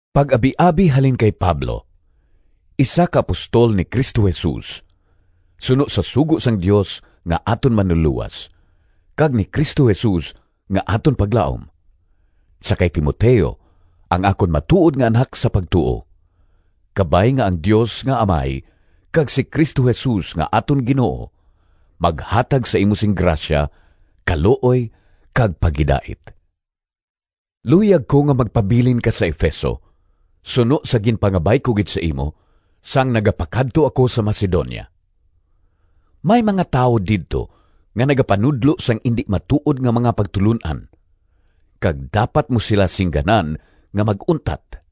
Pag-abiabi halin kay Pablo, isa ka apostol ni Cristo Jesus suno sa sugo sang Dios nga aton Manlulowas kag ni Cristo Jesus nga aton paglaom— Sa kay Timoteo, ang akon matuod nga anak sa pagtuo: Kabay nga ang Dios nga Amay kag si Cristo Jesus nga aton Ginoo maghatag sa imo sing grasya, kaluoy kag paghidait. Luyag ko nga magpabilin ka sa Efeso suno sa ginpangabay ko gid sa imo, sang nagapakadto ako sa Macedonia. May mga tawo didto nga nagapanudlo sang indi matuod nga mga pagtulon-an, kag dapat mo sila singganan nga mag-untat.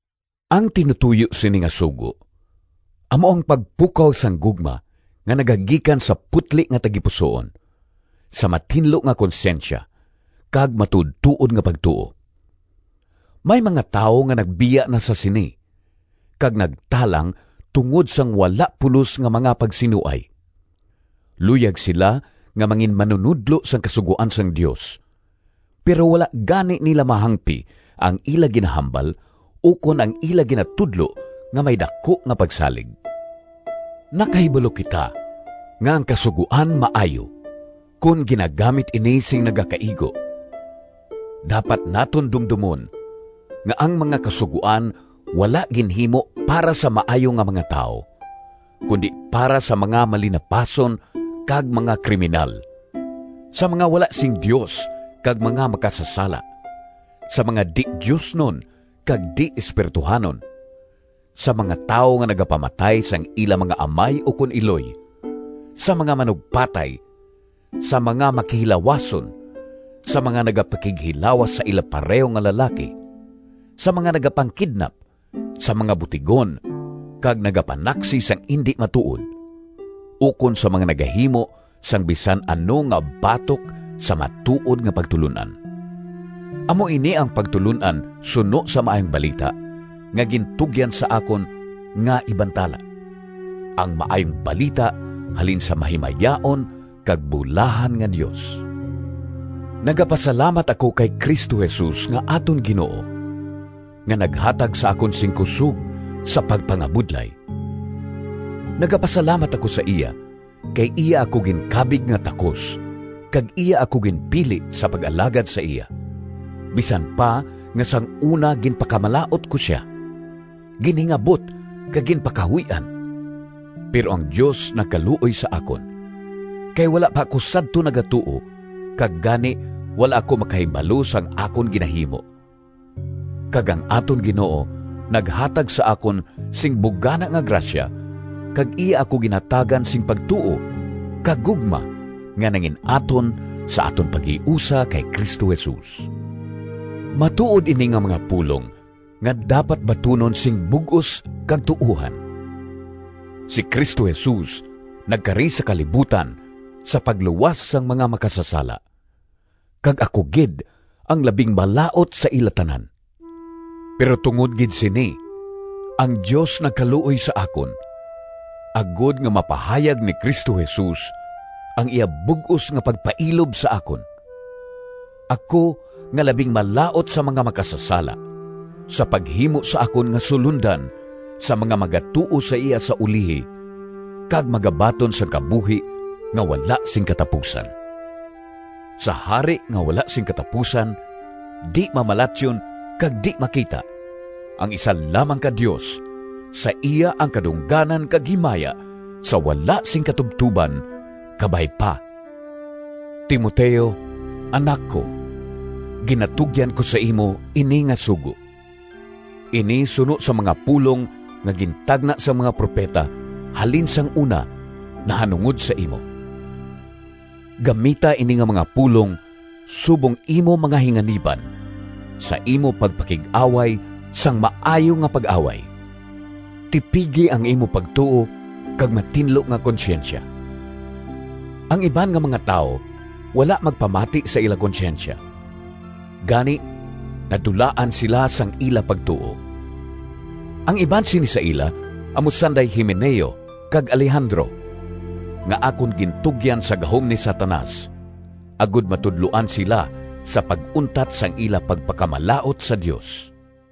Ang tinutoyo sini nga sugo amo ang pagpukaw sang gugma nga nagagikan sa putli nga tagipusoon, sa matinlo nga konsyensya kag matuodtuod nga pagtuo. May mga tawo nga nagbiya na sa sini, kag nagtalang tungod sang wala pulos nga mga pagsinuay. Luyag sila nga manginmanunodlo sang kasugoan sang Dios, pero wala gani nila mahangpi ang ila ginahambal ukon ang ila ginatudlo nga may daku nga pagsalig. Nakahibalo kita nga ang Kasugoan maayo, kon ginagamit ini sing nagakaigo. Dapat naton dumdomon nga ang mga kasugoan wala ginhimo para sa maayo nga mga tawo, kundi para sa mga malinapason kag mga kriminal, sa mga wala sing Dios kag mga makasasala, sa mga di-diosnon kag di-espirituhanon, sa mga tawo nga nagapamatay sang ila mga amay ukon iloy, sa mga manugpatay, sa mga makihilawason, sa mga nagapakighilawas sa ila pareho nga lalaki, sa mga nagapangkidnap, sa mga butigon kag nagapanaksi sang indi matuod, ukon sa mga nagahimo sang bisan ano nga batok sa matuod nga pagtulon-an. Amo ini ang pagtulon-an suno sa Maayong Balita nga gintugyan sa akon nga ibantala, ang Maayong Balita halin sa mahimayaon kag bulahan nga Dios. Nagapasalamat ako kay Cristo Jesus nga aton Ginoo, nga naghatag sa akon sing kusog sa pagpangabudlay. Nagapasalamat ako sa iya, kay iya ako ginkabig nga takos kag iya ako ginpili sa pag-alagad sa iya, bisan pa nga sang una ginpakamalaut ko sia, ginhingabot kag ginpakahuy-an. Pero ang Dios nagkaluoy sa akon, kay wala pa ako sadto nagatuo kag gani wala ako makahibalo sang akon ginahimo. Kag ang aton Ginoo naghatag sa akon sing bugana nga grasya kag iya ako ginhatagan sing pagtuo kag gugma nga nangin-aton sa aton paghiusa kay Cristo Jesus. Matuod ini nga mga pulong nga dapat batunon sing bug-os kag tuohan: si Cristo Jesus nagkari sa kalibutan sa pagluwas sang mga makasasala, kag ako gid ang labing malaut sa ila tanan. Pero tungod gid sini ang Dios nagkaluoy sa akon, agod nga mapahayag ni Cristo Jesus ang iya bug-os nga pagpailob sa akon, ako nga labing malaut sa mga makasasala, sa paghimo sa akon nga sulondan sa mga magatuo sa iya sa ulihi kag magabaton sang kabuhi nga wala sing katapusan. Sa Hari nga wala sing katapusan, di-mamalatyon kag di-makita, ang isa lamang ka Dios, sa iya ang kadungganan kag himaya sa wala sing katubtoban! Kabay pa. Timoteo, anak ko, ginatugyan ko sa imo ini nga sugo. Ini suno sa mga pulong nga gintagna sang mga propeta halin sang una nahanungod sa imo. Gamita ini nga mga pulong subong imo mga hinganiban sa imo pagpakig-away sang maayo nga pag-away. Tipigi ang imo pagtuo kag matinlo nga konsyensya. Ang iban nga mga tawo wala magpamati sa ila konsyensya, gani nadulaan sila sang ila pagtuo. Ang iban sini sa ila amo sanday Himeneo kag Alejandro nga akon gintugyan sa gahom ni Satanas, agod matudloan sila sa pag-untat sang ila pagpakamalaut sa Dios.